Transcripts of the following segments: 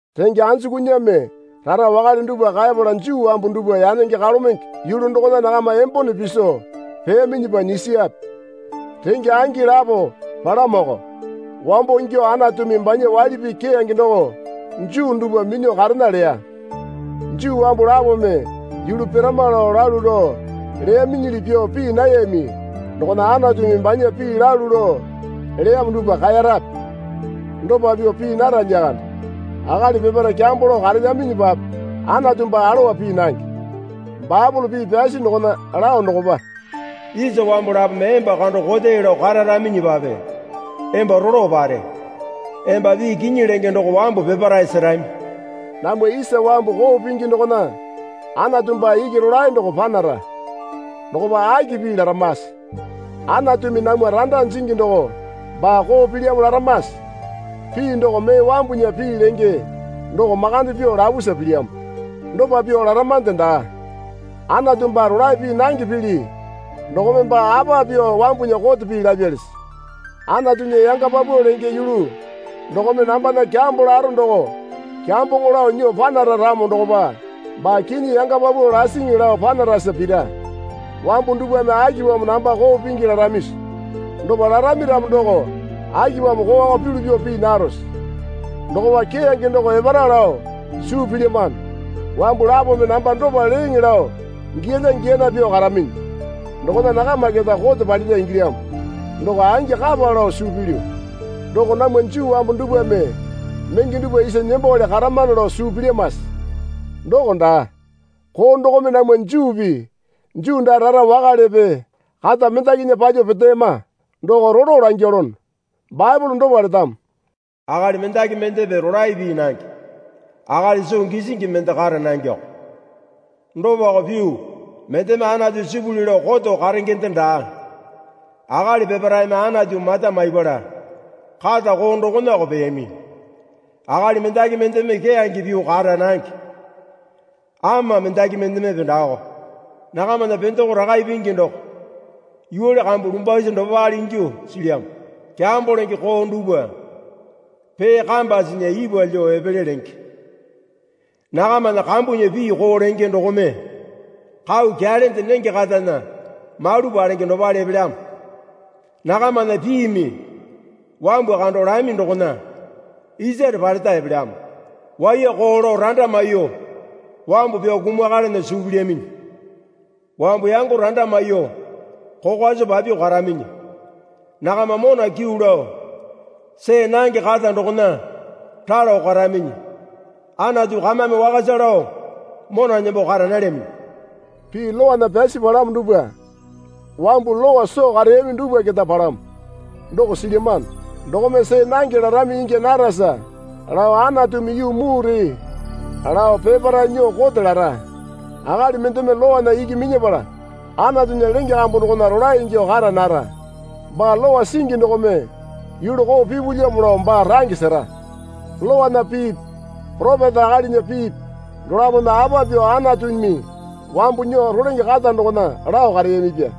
Renge anjukunyame rara wakale dupwa kaepala Juu wambu dupwa yanenge kalomenge yulu dokona nakama embone piso peyaminyipa nyisiyape? Renge angi lapo palamoko. Wambo ingyuo Anatumi banya waili pii keyange doko Juu dupwa minyuo karena leya. Juu wambu lapome yulu pirama lao lalu lao leyaminyili pyuo pii nayami dokona Anatumi banya pii lalu lao leyamo dupwa kaerape? Dopa pyuo pii nara lyakande. Akali peparae kyambo lao karelyaminyipape Anatu baa alowa pii nange. Baepole pii pyasi dokona lao dokopa, Isa wambu lapome emba kando kote lao kararaminyipape emba rolo pare. Emba pii kinyi lenge doko wambu peparae serami. Namwa isa wambu koo pingi dokona Anatu baa iki rolae doko panara. Dokopa aki pii laramase? Anatumi namwa randa jingi doko baa koo pilyamo laramase? (Pii doko mee wambunya pii lenge doko makande pyuo lapusa pilyamo.) Dopa pyuo laramande daa. Anatu baa rolae pii nange pili dokome baa apa pyuo wambunya kote pii lapyalisi? Anatunya yanga paupau lenge yulu dokome nambana kyambo laro doko kyamboŋo lao nyuo panara ramo dokopa baa kinyi yanga paupau lasiŋi lao panarasa pira. Wambu dupwame akipamo namba koo pingi laramisi? Dopa larami ramo doko akipamo kooko pyulu pyuo pii narose? Dokopa keyange doko epara lao suu pilyamano. Wambu lapome namba dopa leeŋe lao giyalya giyana pyuo karaminyi. Dokona nakama keta kote palira ingilyamo. Doko angi kapa lao suu pilyu. Doko namwa Juu wambu dupwame menge dupwa isa nembowale karamano lao suu pilyamase? Doko daa. Koo dokome namwa Juupi Juu daa rara wakalepe kata mendakinya palyuo peteyama, doko rolo langyalono. Baepole dopa letamo. Akali mendaki mendepe rolae pii nange. Akali soo gisingi mende kara nangeko. Dopako pyuo mendeme Anatu sipuli lao koto karengende daa. Akali peparaeme Anatu mata maipala kata koo dokonako peyami. Akali mendaki mendeme keyange pyuo kara nange. Ama mendaki mendemepe daako. Nakamana pendeko rakae pingi doko yuwale kambu lumbwasi dopale ingyuo silyamo. Kyambo lenge koo dupwa pee kambasinya ipwa lyuo epele lenge. Nakamana kambunya pii koo lenge dokome kau kyalende nenge katana mauli palenge dopale epelyamo. Nakamana piimi wambu kando lami dokona isare paleta epelyamo. Waiyako lao randa maiyuo wambu pyao kumakalana suu pilyaminyi. Wambu yango randa maiyuo kokwa soo papyuo karaminyi. Nakama mona kyuu lao see nange kata dokona ralo karaminyi. Anatu kamame wakasa lao mona nembo kara nalyaminyi. Pii Lowana pyasi palamo dupwa wambu Lowa soo kareyami dupwa keta palamo, doko silyamano. Dokome see nange larami ingya narasa lao Anatumi yuu mure lao peparae nyuo kote lara. Akali mendeme Lowana iki minyapala Anatunya lenge kambu dokona rolae ingyuo kara nara. Baa Lowa singi dokome yulu koo pipulyamo lao baa range sera. Lowana piipi poropeta akalinya piipi dolapome apa pyuo Anatumi wambu nyuo rolenge kata dokona lao kareyamipya.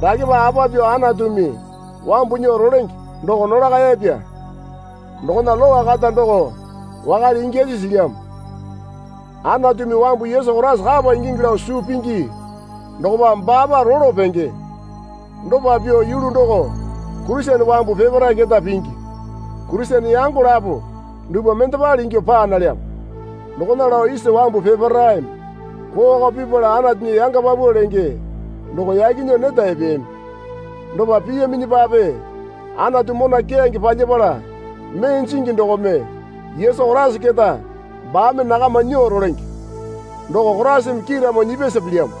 Dakepa apa pyuo Anatumi wambu nyuo rolenge doko nolakayapya. Dokona Lowa kata doko wakale ingyasi silyamo. Anatumi wambu Yesu Koraisa kapa ingingi lao suu pingi dokopa baapa rolo penge. Dopa pyuo yulu doko Kurisene wambu peparae keta pingi. Kurisene yango lapo dupwa mendepale ingyuo paa nalyamo. Dokona lao isa wambu peparaeme koowako pipala Anatunya yanga paupau lenge doko yaki nyuo neta epeyami. Dopa piyaminyipape Anatu mona keyange palyapala mee jingi dokome Yesu Koraisa keta baame nakama nyuo rolenge. Doko Koraisame kiiramo nyipyasa pilyamo.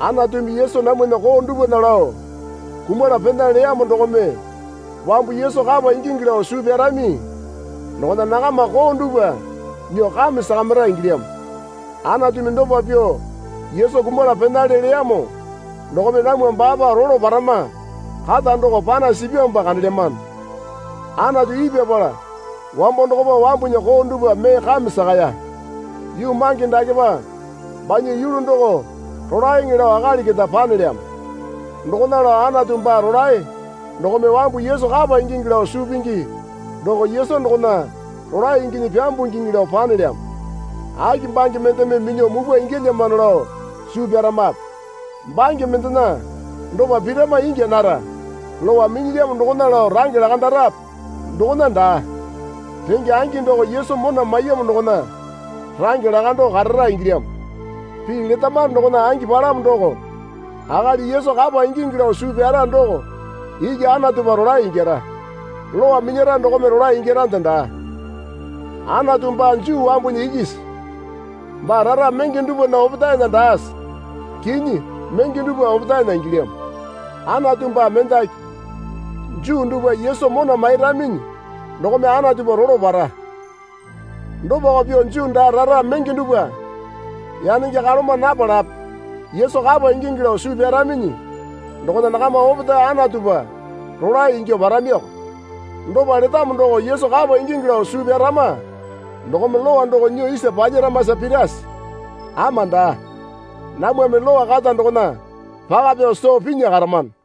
Anatumi Yesu namwana koo dupwana lao kumala pena leyamo dokome wambu Yesu kapa ingingi lao suu pyarami dokona nakama koo dupwa nyuo kame sakamira ingilyamo. Anatumi dopa pyuo Yesu kumala penale leyamo dokome namwa baapa rolo parama kata doko panasi sipyamopa kandelyamano. Anatu ipyapala wambo dokopa wambunya koo dupwa mee kame sakaya. Yuu mange dakepa banya yulu doko rolaeŋe lao akali keta panelyamo. Dokona lao Anatu baa rolae dokome wambu Yesu kapa ingingi lao suu pingi doko Yesu dokona rolae inginyi pyambungiŋi lao panelyamo. Aki bange mendeme minyuo mupwa ingyalyamano lao suu pyaramape? Bange mendena dopa pirama ingya nara. Lowa minyilyamo dokona lao range lakandarape? Dokona daa. Renge angi doko Yesu mona maiyamo dokona range lakando karara ingilyamo. Pii letamano dokona angi palamo doko, akali Yesu kapa ingingi lao suu pyara doko iki Anatupa rolae ingyara. Lowa minyara dokome rolae ingyarande daa. Anatu baa Juu wambunya ikisi? Baa rara menge dupwana opetaena daase? Kinyi menge dupwa opetaena ingilyamo. Anatu baa mendaki. Juu dupwa Yesu mona mairaminyi dokome Anatupa rolo para. Dopako pyuo Juu daa rara menge dupwa yanenge kaloma napalape Yesu kapa ingingi lao suu pyaraminyi dokona nakama opetae Anatupa rolae ingyuo paramiko. Dopa letamo doko Yesu kapa ingingi lao suu pyarama dokome Lowa doko nyuo isa palyaramasa pirase? Ama daa. Namwame Lowa kata dokona paka pyao soo pinya karamano.